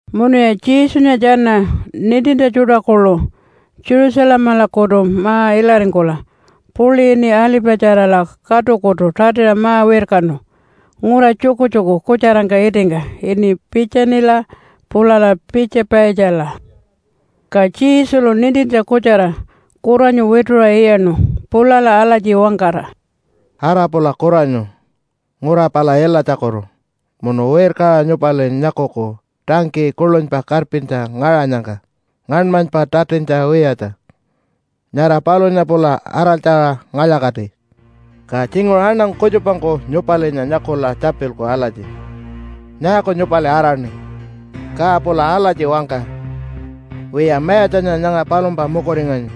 Munuya Jesunya tjana nintintja tjuṯa kuḻu Jerusalemalakutu ma-ilaringkula puḻi ini Alipatjarala katukutu tatiṟa ma-wirkanu ngura tjukutjuku kutjarangka itingka ini Piitjanila pulala Piitja-paitjala. Ka Jesulu nintintja kutjara kuranyu wituṟa iyaṉu pulala alatji wangkara, “Ara pula kuranyu ngura pala ilatjakutu munu wirkaṟa nyupali nyakuku tangkiyi kuḻunypa karpintja ngaṟanyangka ngaṉmanypa tatintja wiyatja. Nyara palunya pula araltjaṟa ngalya-kati. Ka tjinguṟu aṉangu kutjupangku nyupalinya nyakula tjapilku alatji, ‘Nyaaku nyupali araṉi?’ Ka pula alatji wangka, ‘Wiya, Mayatjanya nyanga palumpa mukuringanyi.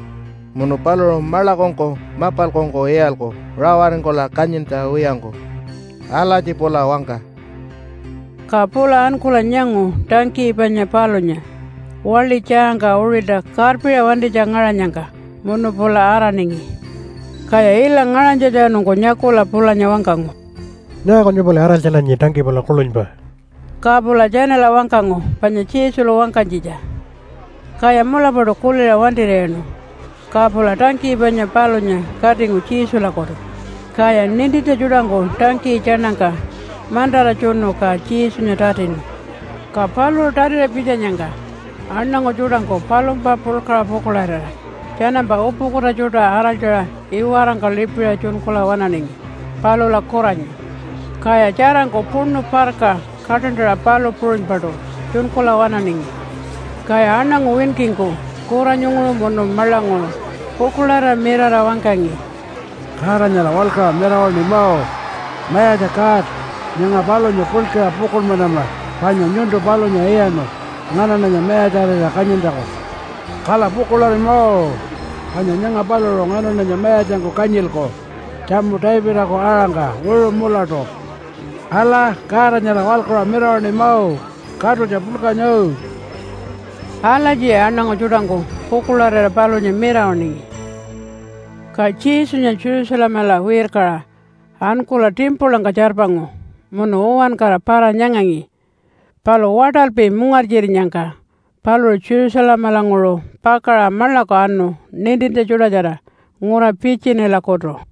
Munu paluṟu maḻakungku mapalkungku iyalku rawaringkula kanyintja wiyangku.’ Alatji pula wangka.” Ka pula ankula nyangu tangkiyi panya palunya waḻi tjaangka uṟilta karpiṟa wantinytja ngaṟanyangka munu pula araningi. Kaya ila ngaṟanytjatjanungku nyakula pulanya wangkangu, “Nyaaku nyupali araltjananyi tangkiyi pala kuḻunypa?” Ka pula tjanala wangkangu panya Jesulu wangkanytjitja. Kaya mulapaṯu kuliṟa wantir'iyaṉu, ka pula tangkiyi panya palunya katingu Jesulakutu. Kaya nintintja tjuṯangku tangkiyi tjaṉangka mantara tjunu ka Jesunya tatinu. Ka paluṟu tatiṟa pitjanyangka aṉangu tjuṯangku palumpa puḻkaṟa pukuḻarira tjanampa upukuta tjuṯa araltjaṟa iwarangka lipiṟa tjunkula waṉaningi palula kuranyu. Kaya tjarangku puṉu parka kaṯantaṟa palu puṟunypaṯu tjunkula waṉaningi. Kaya aṉangu winkingku kuranyunguṟu munu maḻanguṟu pukuḻarira mirara wangkangi, “Godanyala waḻkuṟa mirawaṉima! Mayatja God, nyanga palunya puḻkaṟa pukuḻmanama, panya nyuntu palunya iyaṉu nganaṉanya mayatjarira kanyintjaku. Kala pukuḻarima panya nyanga paluṟu nganaṉanya mayatjangku kanyilku tjamu Davidaku aṟangka wiṟu mulatu. Ala, Godanyala waḻkuṟa mirawaṉima katutja puḻkanya!” Alatjiya aṉangu tjuṯangku pukuḻarira palunya mirawaṉingi. Ka Jesunya Jerusalemala wirkaṟa ankula timpulangka tjarpangu munu uwankara para-nyangangi. Palu waṯalpi mungartjirinyangka paluṟu Jerusalemalanguṟu pakaṟa maḻaku anu nintintja tjuṯatjara ngura Piitjanilakutu.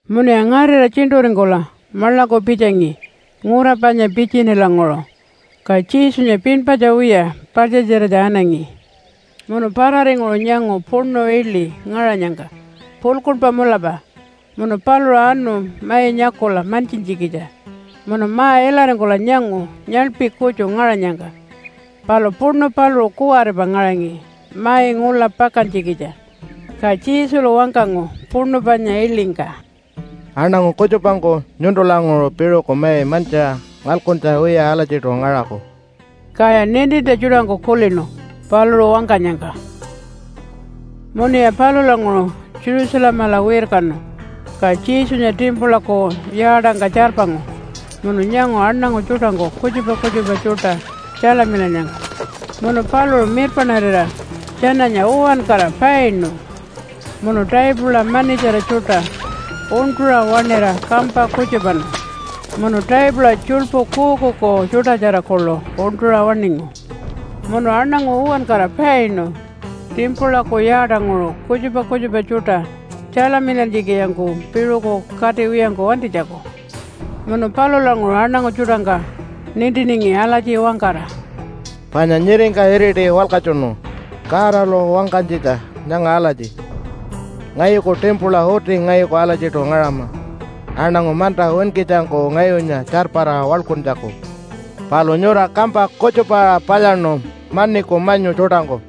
Munuya ngarira tjiṉṯuringkula maḻaku pitjangi ngura panya Piitjanilanguṟu, ka Jesunya pinpatja wiya paḻtjatjiratja anangi. Munu pararinguṟu nyangu puṉu iḻi ngaṟanyangka puḻkuṉpa mulapa. Munu paluṟu anu mai nyakula mantjintjikitja munu ma-ilaringkula nyangu nyaḻpi kutju ngaṟanyangka, palu puṉu paluṟu kuwaripa ngaṟangi mai ngula pakantjikitja. Ka Jesulu wangkangu puṉu panya iḻingka, “Aṉangu kutjupangku nyuntulanguṟu piṟuku mai mantjiṟa ngalkuntja wiya alatjiṯu ngaṟaku.” Kaya nintintja tjuṯangku kulinu paluṟu wangkanyangka. Munuya palulanguṟu Jerusalemala wirkanu, ka Jesunya timpulaku yaatangka tjarpangu munu nyangu aṉangu tjuṯangku kutjupa kutjupa tjuṯa tjalamilannyangka. Munu paluṟu mirpaṉarira tjananya uwankara painu, munu taipula manitjara tjuṯa uṉṯuṟa waṉira kampa kutjupanu munu taipula tjuḻpu kuukuuku tjuṯatjara kuḻu uṉṯuṟa waṉingu. Munu aṉangu uwankara painu timpulaku yaatanguṟu kutjupa kutjupa tjuṯa tjalamilantjikitjangku piṟuku katiwiyangku wantinytjaku. Munu palulanguṟu aṉangu tjuṯangka nintiningi alatji wangkara, “Panya nyiringka iriti walkatjunu Godalu wangkanytjitja nyanga alatji, ‘Ngayuku timpula uti ngayuku alatjiṯu ngaṟama aṉangu manta winkitjangku ngayunya tjarpara waḻkuntjaku.’ Palu nyura kampa kutjupaṟa palyaṉu maniku manyu tjuṯangku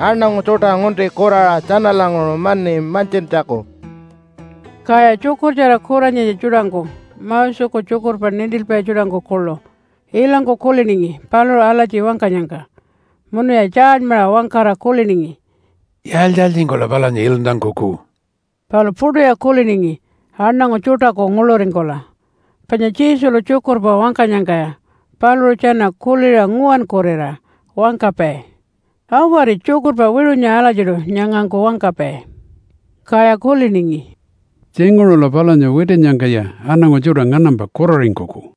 aṉangu tjuṯa ngunti kuraṟa tjanalanguṟu mani mantjintjaku.” Kaya tjukurtjara kuranyitja tjuṯangku Moseku tjukurpa nintilpai tjuṯangku kuḻu ilangku kuliningi paluṟu alatji wangkanyangka, munuya tjaalymaṟa wangkara kuliningi, “Yaaltji-yaaltjingkula palunya iluntankuku?” Palu puṯuya kuliningi aṉangu tjuṯaku nguḻuringkula, panya Jesulu tjukurpa wangkanyangkaya paluṟu tjana kuliṟa nguwankurira wangkapai, “Awari, tjukurpa wiṟunya alatjiṯu nyangangku wangkapai.” Kaya kuliningi, “Tjinguṟula palunya witinnyangkaya aṉangu tjuṯa nganampa kuraringkuku.”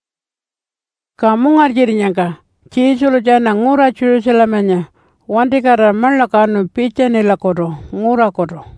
Ka mungartjirinyangka Jesulu tjana ngura Jerusalemanya wantikatira maḻaku anu Piitjanilakutu ngurakutu.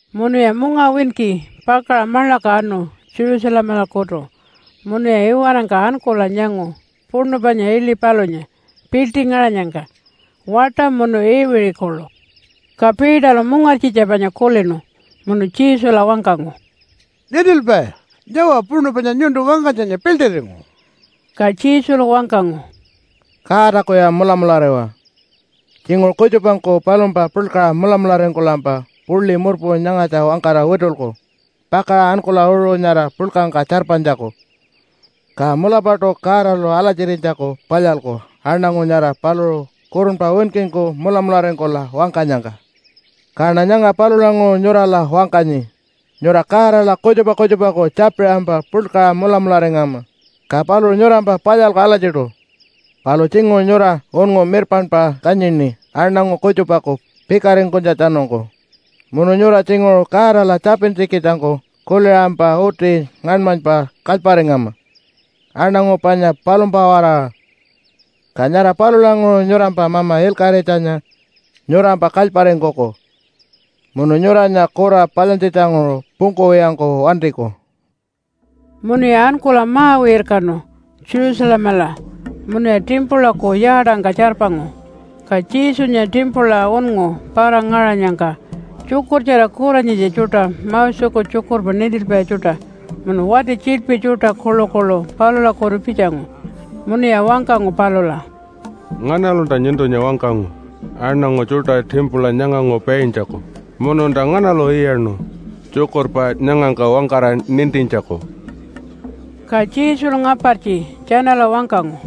Munuya mungawinki pakaṟa maḻaku anu Jerusalemalakutu munuya iwarangka ankula nyangu puṉu panya iḻi palunya piḻṯi ngaṟanyangka, waṯa munu iwiṟi kuḻu. Ka Peterlu mungartjitja panya kulinu munu Jesula wangkangu, “Nintilpai, nyawa puṉu panya nyuntu wangkanytjanya piḻṯiringu.” Ka Jesulu wangkangu, “Godakuya mulamulariwa. Tjinguṟu kutjupangku palumpa puḻkaṟa mulamularingkulampa puḻi murpu nyangatja wangkara witulku pakaṟa ankula uṟu nyara puḻkangka tjarpanytjaku, ka mulapaṯu Godalu alatjirinytjaku palyalku aṉangu nyara paluṟu kurunpa winkingku mulamularingkula wangkanyangka. Kaṉa nyanga palulanguṟu nyurala wangkanyi nyura Godala kutjupa kutjupaku tjapiṟampa puḻkaṟa mulamularingama, ka paluṟu nyurampa palyalku alatjiṯu. Palu tjinguṟu nyura unngu mirpaṉpa kanyini aṉangu kutjupaku pikaringkunytjatjanungku. Munu nyura tjinguṟu Godala tjapintjikitjangku kuliṟampa uti ngaṉmanypa kalyparingama aṉangu panya palumpa-waraṟa, ka nyara palulanguṟu nyurampa Mama Ilkaṟitjanya nyurampa kalyparingkuku munu nyuranya kura palyantjitjanguṟu pungkuwiyangku wantiku.” Munuya ankula ma-wirkanu Jerusalemala munuya timpulaku yaatangka tjarpangu. Ka Jesunya timpula unngu para-ngaṟanyangka tjukurtjara kuranyitja tjuṯa, Moseku tjukurpa nintilpai tjuṯa munu wati tjiḻpi tjuṯa kuḻukuḻu palulakutu pitjangu. Munuya wangkangu palula, “Nganalunta nyuntunya wangkangu aṉangu tjuṯa timpula nyanganguṟu paintjaku? Mununta nganalu iyaṉu tjukurpa nyangangka wangkara nintintjaku?” Ka Jesulu ngapartji tjanala wangkangu,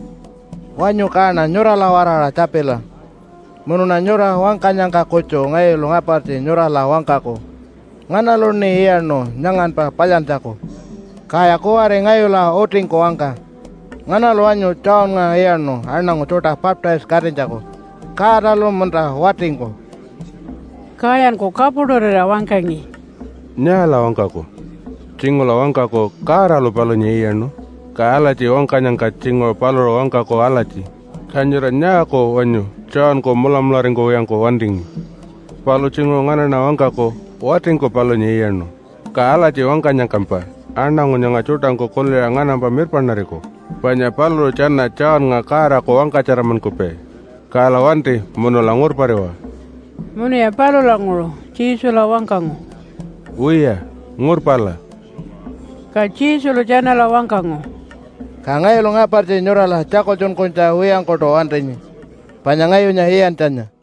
“Wanyu kaṉa nyurala-waraṟa tjapila, munuṉa nyura wangkanyangka kutju ngayulu ngapartji nyurala wangkaku nganaluṉi iyaṉu nyanganpa palyantjaku. Kaya kuwari ngayula utingku wangka, nganalu wanyu Johnnga iyaṉu aṉangu tjuṯa baptise-katinytjaku Godalu munta watingku?” Kayanku kapuṯurira wangkangi, “Nyaala wangkaku? Tjinguṟula wangkaku, ‘Godalu palunya iyaṉu.’ Ka alatji wangkanyangka tjinguṟu paluṟu wangkaku alatji, ‘Ka nyura nyaaku wanyu Johnku mulamularingkuwiyangku wantingi?’ Palu tjinguṟu nganaṉa wangkaku, ‘Watingku palunya iyaṉu.’ Ka alatji wangkanyangkampa aṉangu nyanga tjuṯangku kuliṟa nganampa mirpaṉariku panya paluṟu tjana Johnnga Godaku wangkatjaranmankupai. Kala wanti munula ngurpariwa.” Munuya palulanguṟu Jesula wangkangu, “Wiya, ngurpala.” Ka Jesulu tjanala wangkangu, “Ka ngayulu ngapartji nyurala tjakultjunkunytja wiyangkuṯu wantinyi panya ngayunya iyantjanya.”